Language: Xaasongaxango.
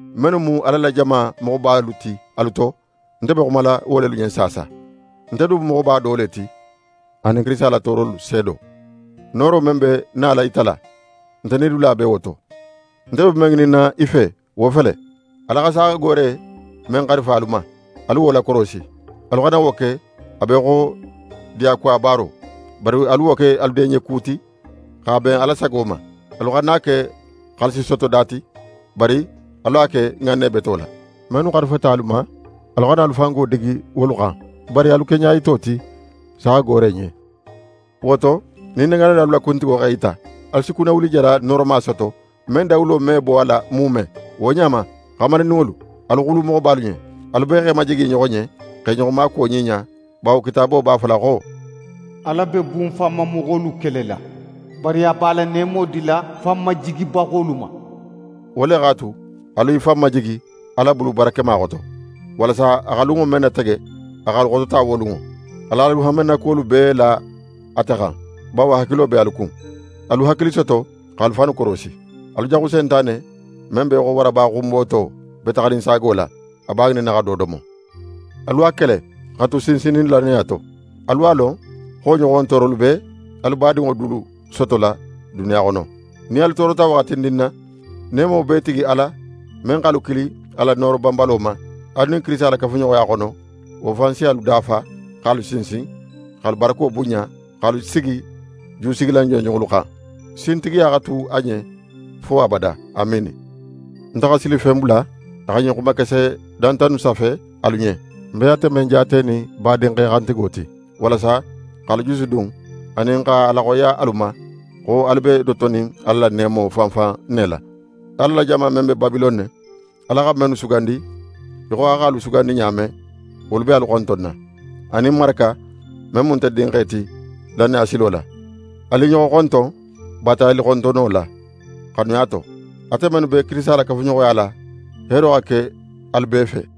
Mennu mu Ala la jama moxobalu ti alu to, nte be xumala wo lelu ɲen saasa. Nte du mu moxoba do le ti anin Kirisita la toorolu seedo. Nooro men be nala yitala, nte nidula be wo to. Nte be men ŋininna i fe, wo fele: Ala xa saaxagoore men xarifa alu ma, alu wo lakorosi. Alu xana wo ke a be í xo diyakuwa baaro, bari alu wo ke alu diyanɲeku ti, x'a ben Ala sago ma. Alu xana a ke xaalisisotoda ti, bari alu a ke ŋanne beto la. Mennu xarifata alu ma, alu xana alu la fango digi wolu xan, bari alu ke ɲayito ti saaxagoore ɲen. Wo to, nin negaanilalu la kuntigo x'é yita, alu si kunnawulijala nooroma soto, men dawulo me bo a la muume. Wo ɲa ma, xamarindinŋolu, alu xulu moxobalu ɲen. Alu bee x'e majigi i ɲoxo ɲen, x'e ɲoxo maakuwo ɲiɲa, bawo Kitaabo b'a fola xo: «Ala be bunfanmamoxolu kelela, bari a be a la neemo dila fanmajigibaxolu ma.» Wo le x'a tu, alu i fan majigi Ala bulu barakema xoto, walasa a xa lunŋo men natege, a x'alu xotota wo lunŋo. Al'alu hanmenakuwolu bee la ate xan, bawo a hakilo be alu kun. Alu hakili soto, x'alu fannu korosi! Alu jaxu Sentane, men be í xo waraba xunboto, be taxaninsaago la, a b'a ŋininna xa do domo. Alu a kele, xa tu sinsinnin lannaya to. Alu a lon xo wo ɲoxon toorolu be alu badinŋo dulu sotola duniya xono. Nin alu toorota waxatindin na, neemo bee tigi Ala men x'alu kili a la nooro banbalo ma, alu nin Kirisita la kafuɲoxoya xono, wo fan si alu dafa, x'alu sinsin, x'alu barako bunɲa, x'alu sigi jusigilan jonjonŋolu xan. Sintigiya xa tu a ɲen fo abada. Amiini! Nte xa Silifen bula a xa ɲin xuma kese danta innu safe alu ɲen, ń be ate men jaatenin badinxe xantigo ti, walasa x'alu jusudun anin x'a laxoyiya alu ma xo alu be notonin Ala la neemo fan fan ne la. Ala la jama men be Babilone, Ala xa mennu sugandi í xo a x'alu sugandi ɲa men, wolu be alu xontonna, anin Maraka men mu nte dinxe ti lannaya silo la. Alu i ɲoxo xonton baatayalixontonno la, xanuya to. Ate mennu be Kirisita la kafuɲoxoya la, heero xa ke alu bee fe!